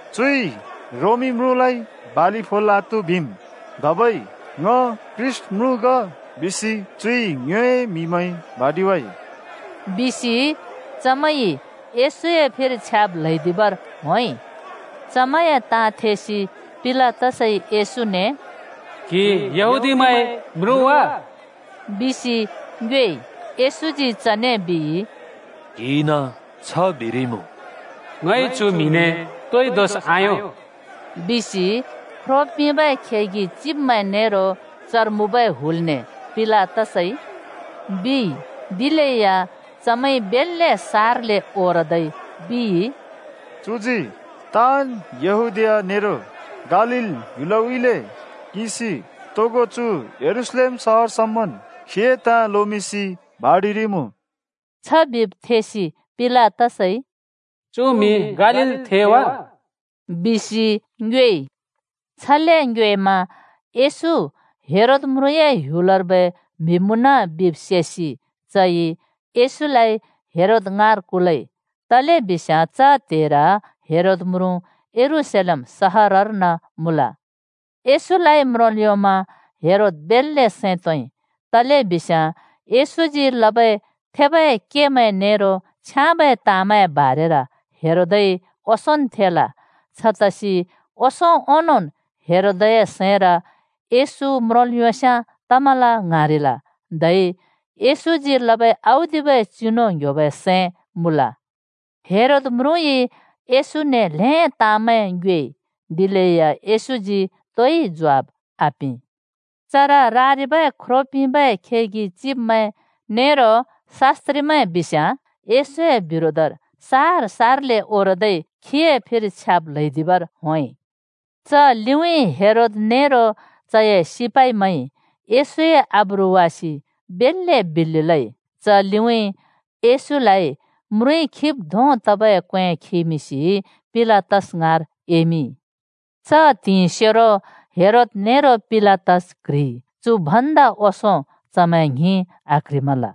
“चुइ ‘रोमी म्रुँलाइ बालि फोल् आत्‍हु,’ बिम्, धबै ‘ङ ख्रीष्‍ट म्रुँ ग,’ बिसि चुइ ङ्योए म्हिमैं भाँडिवाइ,” बिसि चमैंइ येशूए फिर छ्याब् ल्हैदिबर होंइ। चमैंए ताँ थेसि पिलातसइ येशूने “क्‍हि यहूदीमैंए म्रुँ वा?” बिसि ङ्योएइ। येशूजी चने बिइ, “क्‍हिइन छ बिरिइमुँ।” “ङइ चु म्‍हिने तोइ दोष आयों बिसि ख्रो पिंबै खेगि चिब्मैं नेरो चर मुँबै हुलने पिलातसइ,” बिइ। दिलेया चमैंइ बेल्‍‍‍ले सारले ओरदै बिइ, “चुजी ताँन् यहूदीया नेरो गालील ह्‍युलउँइँले किंसि तोगो चु यरूशलेम सहर समन् खीए ताँ लोमिंसि भाँडिरिइमुँ।” छ बिब् थेसि पिलातसइ “चु म्‍हि गालीलथें वा? बिसि ङ्योएइ।” छले ङ्योएमा येशू हेरोद म्रुँए ह्‍युलर्बै म्‍हि मुँन बिब् सेसि चइ येशूलाइ हेरोद ङाँर कुलइ, तलेबिस्याँ च त्‍हेर हेरोद म्रुँ यरूशलेम सहरर्न मुँल। येशूलाइ म्रोंल् योंमा हेरोद बेल्‍ले सैं तोंइ। तलेबिस्याँ येशूजी लबै थेबै केमैं नेरो छ्याँबै ताँमैं बारेर हेरोदइ ओंसोंन् थेल। छतसि ओंसों ओंनोंन् हेरोदए सैंर येशू म्रोंल् योंस्याँ तमल ङ्हाँरिल। धै येशूजी लबै औदिबै चिनु ङ्‍ह्‍योबै सैं मुँल। हेरोद म्रुँइ येशूने ल्‍हें ताँमैं ङ्योएइ। दिलेया येशूजी तोइ ज्वाफ आपिं। चर रारिबै ख्रो पिंबै खेगि चिब्मैं नेरो शास्‍त्रिमैं बिस्याँ येशूए बिरोधर सार-सारले ओरदै खीए फिर छ्याब् ल्‍हैदिबर होंइ। च लिउँइँ हेरोद नेरो चए सिपाइमैंइ येशूए आब्रु वासि बेल्‍ले बिल्‍लि लइ। च लिउँइँ म्रुँइ खिब् धों तबै क्‍वें येशूलाइ खिमिंसि पिलातस ङाँर एमिंइ। च त्हिंइसेरो हेरोद नेरो पिलातस क्‍ह्रिइ। चु भन्दा ओंसों चमैं ङ्हिं आक्ह्रिमल।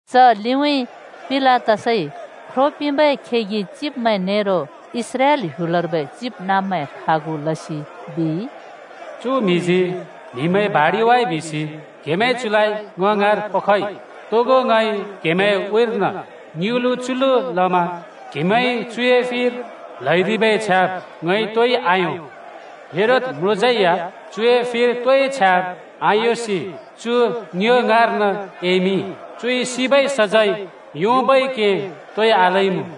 च लिउँइँ पिलातसइ ख्रो पिंबै खेगि चिब्मैं नेरो इस्राएल ह्‍युलर्बै चिबनाँब्मैं खागु लसि बिइ, “चु म्हिजी म्हिमैं भाँडिवाइ बिसि क्‍हेमैंइ चुलाइ ङ ङाँर पखइ। तोगो क्‍हेमैंए उँइँर्न ङ्युँलु च्युलु लमा क्‍हेमैंइ चुए फिर ल्हैदिबै छ्याब् ङइ तोइ आयों। हेरोद म्रुँज्‍यै या चुए फिर तोइ छ्याब् आयोंसि चु ङ्यो ङाँर्न एमिंइ। चुइ सिबै सजैं योंबै के तोइ आलइमुँ।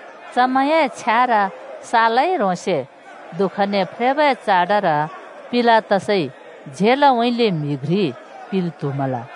चमैंए छ्यार सालै ह्रोंसे दुःखने फ्रेबै चाडर पिलातसइ झेलउँइँले म्हि घ्रि पिल् त्‍हुमल।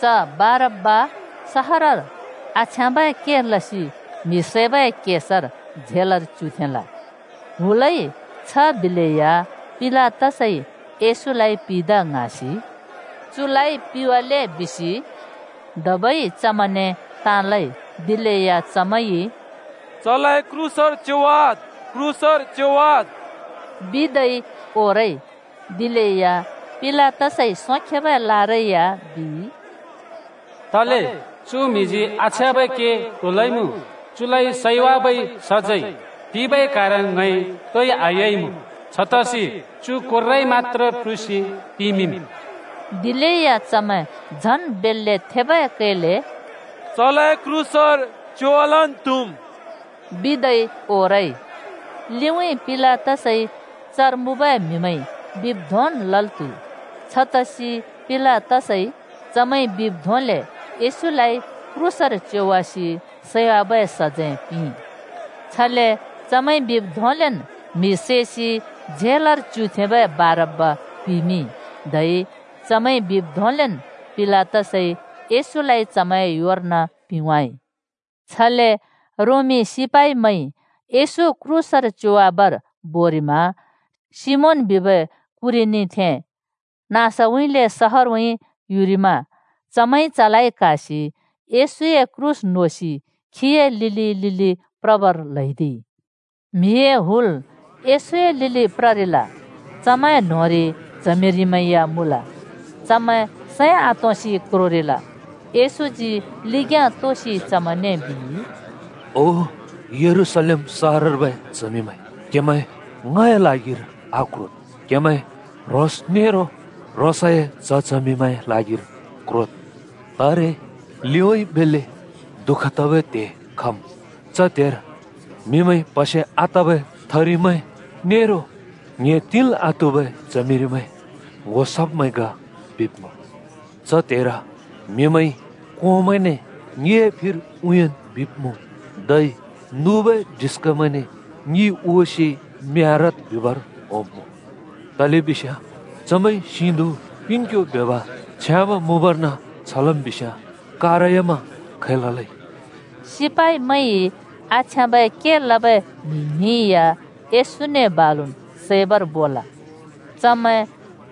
च बारब्‍बा सहरर आछ्याँबै के लसि म्‍हि सैबै केसर झेलर च्‍युथेंल। हुलइ छ बिलेया पिलातसइ येशूलाइ पिदा ङ्हाँसि “चुलाइ पिवाले बिसि” धबै चमैंने ताँ लइ। दिलेया “चलाइ क्रूसर च्‍योवाद्! क्रूसर च्‍योवाद्!” बिदै चमै ओरइ। दिलेया पिलातसइ सोंखेबै लारै या बिइ, “तले? चु म्हिजी आछ्याँबै के तो लइमुँ? चुलाइ सैवाबै सजैं पिंबै कारण ङइ तोइ आयोंइमुँ। छतसि चु कोर्राइ मत्‍त्रे प्रुसि पिमिंम्।” दिलेया चमैं झन् बेल्‍ले थेबै कैले “चलाइ क्रूसर च्‍योवालन् त्‍हुम् बिदै ओरइ।” लिउँइँ पिलातसइ चर मुँबै म्हिमैंइ बिब् धोंन् लल् त्‍हुइ। छतसि पिलातसइ चमैंइ बिब् धोंले येशूलाइ क्रूसर च्‍योवासि सैवाबै सजैं पिंइ। छले चमैंइ बिब् धोंलेन् म्‍हि सैसि झेलर च्‍युथेंबै बारब्‍बा पिमिंइ। धै चमैंइ बिब् धोंलेन् पिलातसइ येशूलाइ चमैंए योर्न पिंवाइ। छले रोमी सिपाइमैंइ येशू क्रूसर च्‍योवाबर बोरिमा सिमोन बिबै कुरेनीथें नाँसउँइँले सहरउँइँ युरिमा चमैंइ चलाइ क्‍हासि येशूए क्रूस नोसि खीए लिलि लिलि प्रबर ल्हैदिइ। म्हिए हुल येशूए लिलि प्ररिल। चमैं न्‍होंरि च्हमिरिमैं या मुँल। चमैं सैं आतोंसि क्रोरिल। येशूजी लिग्‍याँ तोसि चमैंने बिइ, “ओ यरूशलेम सहरर्बै च्हमिमैं, क्हेमैं ङए ल्हागिर आक्रोद्, क्हेमैं ह्रोंस् नेरो ह्रोंसए च्‍ह-चमिए ल्हागिर क्रोद्। तारे लिउँइँ बेल्‍ले दुःख तबै त्‍हे खम्। च त्‍हेर ‘प्‍हसे आतबै थरिमैं नेरो ङ्‍हे तिंल् आत्‍हुबै च्हमिरिमैं ङ्‍हो सब्मैं ग बिसि म्हिमैंइ,’ बिब्मुँ। च त्‍हेर म्हिमैंइ ‘कोंमैंने ङिए फिर उँयान् बिब्मुँ, धै नुबै डिस्कामैंने ङि हुवासि म्यारवाद्’ बिबर होंब्‍मुँ। तलेबिस्याँ चमैंइ सिधुँ पिंङक्यो ब्योंब छ्याँब मुँबर्न छ लम् बिस्याँ कारयामा खै ललै?” सिपाइमैंइ आछ्याँबै के लबै म्हि ङ्हिं या येशूने बालुन् सैबर बोल। चमैं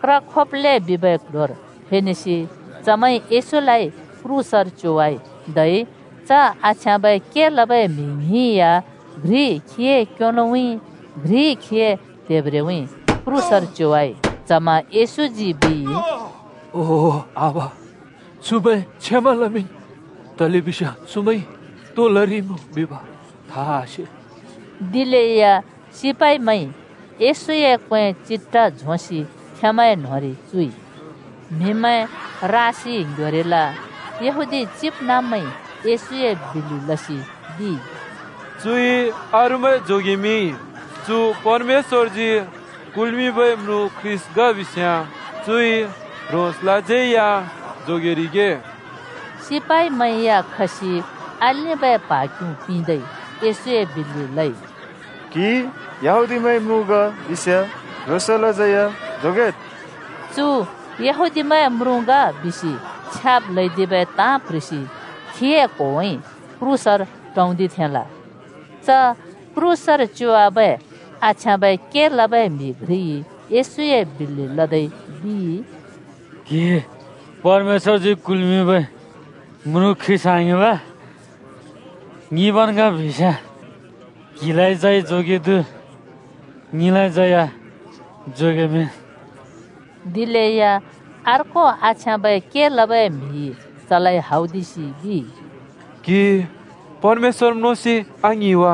क्र खोप्‍लें बिबै क्‍ल्‍ह्‍योर फेनेसि चमैंइ येशूलाइ क्रूसर च्‍योवाइ। धै च आछ्याँबै के लबै म्हि ङ्हिं या घ्रि खीए क्योलोउँइ, घ्रि खीए त्हेब्रेउँइँ क्रूसर च्योवाइ। च्हमा येशूजी बिइ, “ओ आबा, चुमैं क्षमा लमिंन्, तलेबिस्याँ चुमैंइ तो लरिइमुँ बिब था आसे।” दिलेया सिपाइमैंइ येशूए क्वें चिट्ठा झोंसि खेंमैंए न्‍होंरि चुइ। म्हिमैं रासि ङ्‌ह्‍योरिल। यहूदी चिबनाँब्मैंइ येशूए बिल्‍लि लसि बिइ, “चुइ अरूमैं जोगेमिंइ। चु परमेश्‍वरजी कुल्‍मिंबै म्रुँ ख्रीष्‍ट ग बिस्‍याँ चुइ ह्रोंसलाज्यै या जोगेरिगे।” सिपाइमैं या खसि आलिंबै प्हा क्युँ पिंदै येशूए बिल्‍लि लइ। “क्‍हि यहूदीमैंए म्रुँ ग बिस्‍याँ ह्रोंसलाज्यै जोगेद्।” “चु यहूदीमैंए म्रुँ ग” बिसि छ्याब् ल्हैदिबै ताँ प्ह्रिसि खीए क्होवाइ क्रूसर टाँउँदिथेंल। च क्रूसर च्‍योवाबै आछ्याँबै के लबै म्हि घ्रिइ येशूए बिल्‍लि लदै बिइ, “क्‍हि परमेश्‍वजी कुल्मिंबै म्रुँ ख्रीष्‍ट आङिं वा? ङिंबन् ग बिस्‍याँ क्हिलाज्यै जोगेदु, ङिलाज्यै या जोगेमिंन्।” दिलेया अर्को आछ्याँबे के लबै म्हिइ चलाइ हौदिसि बिइ, “क्‍हि परमेश्‍वर म्रोंसि आङ्हिं वा?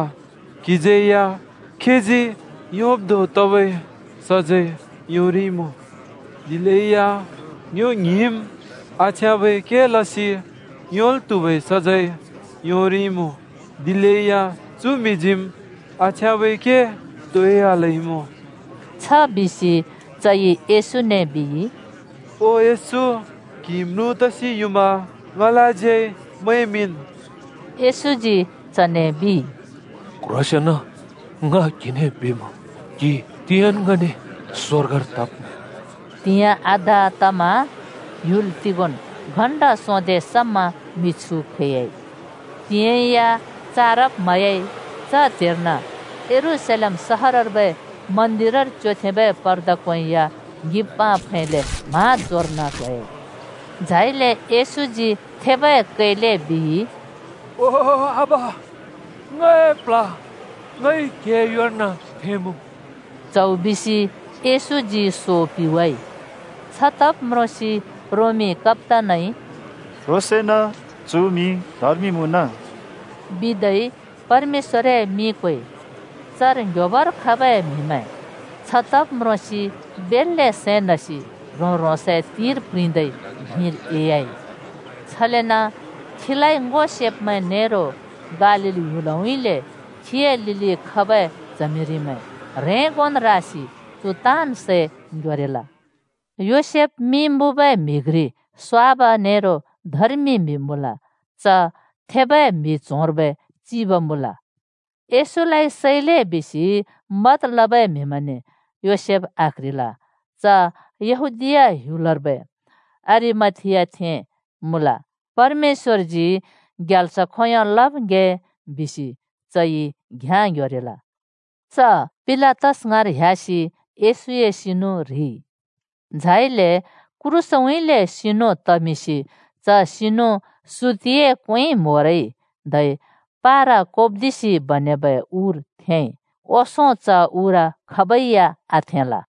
खीजी योंब् धों तबै सजैं क्हिज्यैया योंरिइमुँ। दिलेया ङ्यो ङ्हिंम् आछ्याँबै के लसि योंल् त्‍हुबै सजैं योंरिइमुँ, दिलेया चु म्‍हिजीम् आछ्याँबै के तोइ आलइमुँ।” छबिसि चइ येशूने बिइ, “ओ येशू, क्‍हि म्रुँ तसि युमा ङलाज्यै मैंमिंन् ओ।” येशूजी चने बिइ, “क्‍ह्रोसेंन ङ क्हिने बिमुँ, क्‍हि तिंयाँन् ङने स्‍वर्गर तब्‍मुँ।” त्‍हिंयाँ आधा तमा ह्‍युल तिगोंन् घण्‍टा सोंदे समा मिछु खैयाइ। त्हिंयाँ या चारब म्हयाइ। च त्‍हेर्न यरूशलेम सहरर्बै मन्दिरर च्योथेंबै पर्दा क्‍वें या ङ्हिंबाँ फैले म्हाँजोर्न ट्होयाइ। झाइले येशूजी थेबै कैले बिइ, “ओ आबा, ङए प्ल्ह ङइ क्‍हिए योर्न थेंमुँ।” च्हौ बिसि येशूजी खीए सो पिवाइ। छतब् म्रोंसि “क्‍ह्रोंसेंन चु म्‍हि धर्मि मुँन!” बिदै रोमी कप्‍तानइ परमेश्‍वरए मिं क्वेइ। चर ङ्ह्‍योबर खबै म्हिमैंइ छ तब् म्रोंसि बेल्‍ले सैं नसि ह्रों-ह्रोंसए तिंर प्रिंदै धिंर एह्‍याइ। छलेन खीलाइ ङो सेब्मैं नेरो गालील ह्‍युलउँइँले खीए लिलि खबै च्हमिरिमैं ह्रेंगोन् रासि चर तरिबै ताँन् सै ङ्‍ह्‍योरिल। योसेफ मिं मुँबै म्‍हि घ्रि स्‍वाब नेरो धर्मि म्‍हि मुँल। च थेबै म्हि च्होंर्बै चिब मुँल। येशूलाइ सैले बिसि मत लबै म्हिमैंने योसेफ आक्ह्रिल। च यहूदीया ह्‍युलर्बै अरिमथियाथें मुँल। परमेश्‍वरजी खन्‍तोंदोंन् ग्याल्स खोंयों लब् ङ्‍हे बिसि चइ घ्‍याँ ङ्‌ह्‍योरिल। च पिलातस ङाँर ह्‍यासि येशूए सिनु ह्रिइ। झाइले क्रूसउँइँले सिनु तमिंसि। च सिनु सुतिए क्‍वेंइ म्होरइ धै पारा कोप्दिसि बनेबै उर थेंइ। ओंसों च उर खाबै या आथेंल।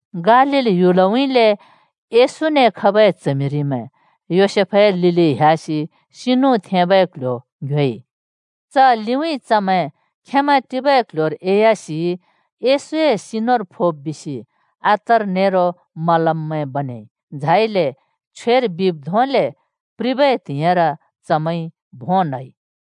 गालील ह्‍युलउँइँले येशूने खबै च्हमिरिमैं योसेफए लिलि ह्‍यासि सिनु थेंबै क्‍ल्‍ह्‍यो ङ्‍ह्‍योइ। च लिउँइँ चमैं खेंमैं टिबै क्‍ल्‍ह्‍योर एह्‍यासि येशूए सिनुर फोब् बिसि अत्तर नेरो मलममैं बनेइ। झाइले छ्वेर बिब् धोंले प्रिबै त्हिंइर चमैंइ भों न्‍हइ।